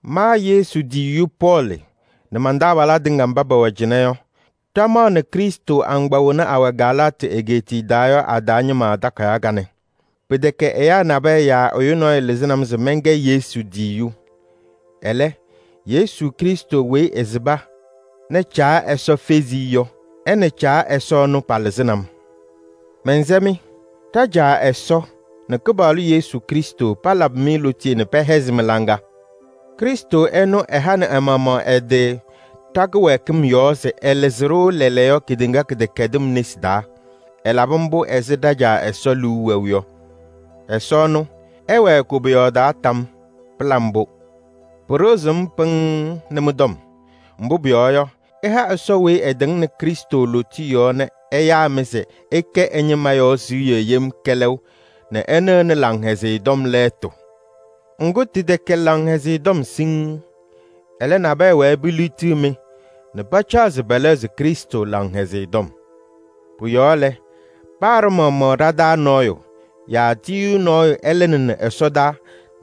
Ma Yesu tiyiyu Pɔɔlɩ nɛ man-taabalaa tɩŋa mba pɛwɛ cɩnɛ yɔ, ɖɩmaɣnɩ Krɩstʋ agbaa wena awɛ Galaatɩ egeetiye taa yɔ a-taa ñɩma takayaɣ kanɛ. Pɩtɛkɛ ɛyaa nabɛyɛ yaa ɛyʋ nɔɔyʋ lɩzɩnɩ-m se mɛnkɛ Yesu tiyiyu. Ɛlɛ, Yesu Krɩstʋ weyi ɛsɩba nɛ Caa Ɛsɔ fezi-i yɔ, ɛ nɛ Caa Ɛsɔ ɛnʋ, palɩzɩnɩ-m. Mɛnsɛ-mɩ: ɖa-Caa Ɛsɔ nɛ Kɩpaɣlʋ Yesu Krɩstʋ palabɩ-mɩ lootiye nɛ pɛhɛzɩ mɩ-laŋa. Krɩstʋ ɛnʋ ɛhanɩ ɛ-maɣmaɣ ɛ-tɩ ɖa-kɩwɛɛkɩm yɔɔ se ɛlɩzɩ-ɖʋ lɛɛlɛɛyɔ kedeŋa kɩdɛkɛdɩm nesi taa. Ɛlabɩ mbʋ ɛzɩ ɖa-Caa Ɛsɔ liu wɛʋ yɔ. Ɛsɔ ɛnʋ, ɛwɛɛ koboyaɣ taa tam yɔɔ! Pɩla mbʋ! Pɩɖɩɣzɩ-m pɩŋŋ nɛ mɩ-tɔm. Mbʋ pʋyɔɔ yɔ, ɩtɩha Ɛsɔ weyi ɛtɩŋnɩ Krɩstʋ lootiye yɔɔ nɛ ɛyaa-mɩ se ɩkɛ ɛ-ñɩma yɔ siɣye nɛ ɩnɩɣnɩ Laŋhɛzɩyɛ Tɔm lɛɛtʋ. Ŋgʋ, tɩtɛkɛ Laŋhɛzɩyɛ Tɔm siŋŋ. Ɛlɛ, nabɛyɛ wɛɛ peliɣtiɣ-mɩ nɛ pacaɣ se pɛlɛɣzɩ Krɩstʋ Laŋhɛzɩyɛ Tɔm. Pʋ-yɔɔ lɛ, paa ɖa-maɣmaɣ ɖa-taa nɔɔyʋ yaa tiyiyu nɔɔyʋ ɛlɩnɩnɩ ɛsɔdaa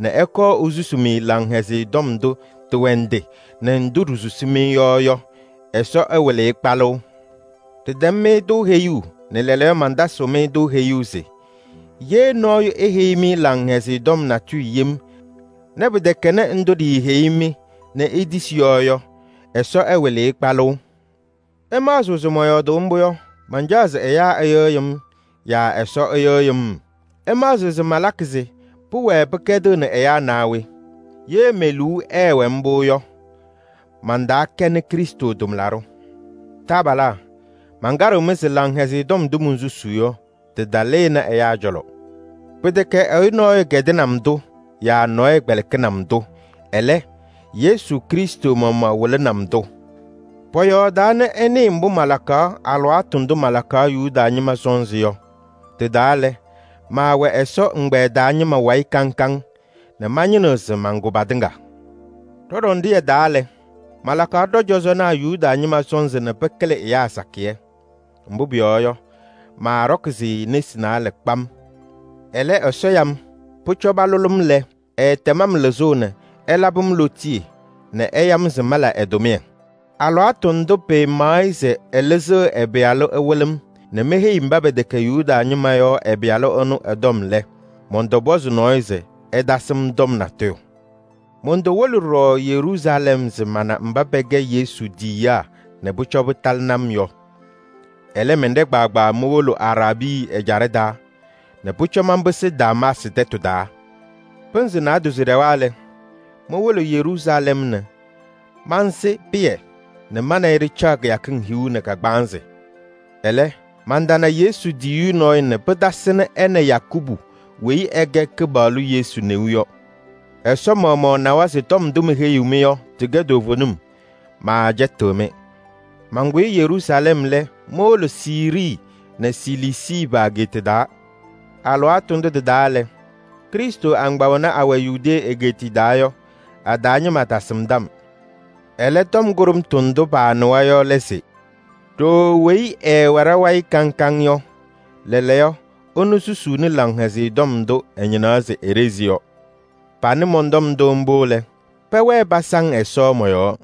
nɛ ɛkɔɔ esusuu-mɩ Laŋhɛzɩyɛ Tɔm ndʋ tɩwɛ ndɩ nɛ ndʋ ɖisusi-mɩ yɔ yɔ, Ɛsɔ ɛwɩlɩ-ɩ kpalʋʋ! Ɖɩtɛm-mɩ-tʋ heyuu nɛ lɛɛlɛɛyɔ mantasɩɣ-mɩ-tʋ heyuu se: ye nɔɔyʋ eheyi-mɩ Laŋhɛzɩyɛ Tɔm natʋyʋ yem nɛ pɩtɛkɛnɩ ndʋ ɖiiheyi-mɩ nɛ itisi yɔ yɔ, Ɛsɔ ɛwɩlɩ-ɩ kpalʋʋ! Ɩmaɣzɩɣ se mɔyɔɔdʋʋ mbʋ yɔ, mancaɣ se ɛyaa ɩyɩɣyɩ-m yaa Ɛsɔ ɛyɩɣyɩnɩ-m? Ɩmaɣzɩɣ se malakɩ se pɩwɛɛ pɩkɛdɩɣnɩ ɛyaa naa we? Ye me-liu ɛɛwɛ mbʋ yɔ, mantaakɛnɩ Krɩstʋ tʋmlaɖʋ. Taabalaa! Mankaɖɩɣ-mɩ se Laŋhɛzɩyɛ Tɔm ndʋ monsusuu yɔ, tɩtalɩnɩ ɛyaa cɔlɔ. Pɩtɛkɛ ɛyʋ nɔɔyʋ kɛdɩnɩ-m-tʋ yaa nɔɔyʋ kpɛlɩkɩnɩ-m-tʋ, ɛlɛ, Yesu Krɩstʋ maɣmaɣ wɩlɩnɩ-m-tʋ. Pɔyɔɔdaa nɛ ɩnɩɩ mbʋ malakaɣ alɩwaatʋ ndʋ malakaɣ Yuda ñɩma sɔnzɩ yɔ. Tɩ-taa lɛ, maawɛ Ɛsɔ ɛgbɛyɛ taa ñɩma wayɩ kaŋ kaŋ nɛ mañɩnɩɣ se mankʋ patɩŋa. Ɖɔ-ɖɔndɩyɛ taa lɛ, malakaɣ ɖɔ-cɔzɔnaa Yuda ñɩma sɔnzɩ nɛ pɩkɩlɩ ɛyaa sakɩyɛ. Mbʋ pʋyɔɔ yɔ, maaɖɔkɩ-sɩ nesi naalɛ kpam. Ɛlɛ, Ɛsɔ ya-m. Pʋcɔ palʋlɩ-m lɛ, ɛɛtɛm-m lɩzʋʋ nɛ ɛlabɩ-m lootiye nɛ ɛya-m se mala ɛ-tʋmɩyɛ. Alɩwaatʋ ndʋ pɩmaɣ-ɩ se ɛlɩzɩɣ ɛ-Pɩyalʋ ɛwɩlɩ-m nɛ meheyi mba pɛtɛkɛ Yuda ñɩma yɔ ɛ-Pɩyalʋ ɛnʋ ɛ-tɔm lɛ, mɔntɔpɔzɩ nɔɔyʋ se ɛtasɩ-m tɔm natʋyʋ. Montowolo ɖɔɖɔ Yeruusalɛm se mana mba pɛkɛ Yesu tiyiyaa nɛ pʋcɔ pɩtalɩnɩ-m yɔ. Ɛlɛ, mɛnɖɛ kpaagbaa mowolo Araabii ɛjaɖɛ taa nɛ pʋcɔ manpɩsɩ Damaasɩ tɛtʋ taa. Pɩnzɩ naadozo ɖɛwa lɛ, mowolo Yeruusalɛm nɛ mansɩ Pɩyɛ nɛ ma nɛ ɩ ɖɩcaɣ kɩyakɩŋ hiu nɛ kagbaanzɩ. Ɛlɛ, mantana Yesu tiyiyu nɔɔyʋ nɛ pɩtasɩnɩ ɛ nɛ Yakubu weyi ɛkɛ Kɩpaɣlʋ Yesu neu yɔ. Ɛsɔ maɣmaɣ nawa se tɔm ndʋ meheyiɣ-mɩ yɔ tɩkɛ toovenim, maacɛtɩɣ-mɩ. Mankʋyɩ Yeruusalɛm lɛ, mowolo Siirii nɛ Siliisii pa-ageeta taa. Alɩwaatʋ ndʋ tɩ-taa lɛ, Krɩstʋ agbaa wena awɛ Yudee egeetiye taa yɔ, a-taa ñɩma tasɩmdɩ-m. Ɛlɛ, tɔm kʋɖʋmtʋ ndʋ paanɩwa yɔ lɛ se: “Ɖooo weyi ɛɛwɛ ɖa-wayɩ kaŋ kaŋ yɔ, lɛɛlɛɛyɔ, ɛnʋ susuuni Laŋhɛzɩyɛ Tɔm ndʋ ɛñɩnaɣ se eɖezi yɔ.” Panɩ mɔn-tɔm ndʋ mbʋ lɛ, pɛwɛɛ pasaŋ Ɛsɔ mɔ-yɔɔ.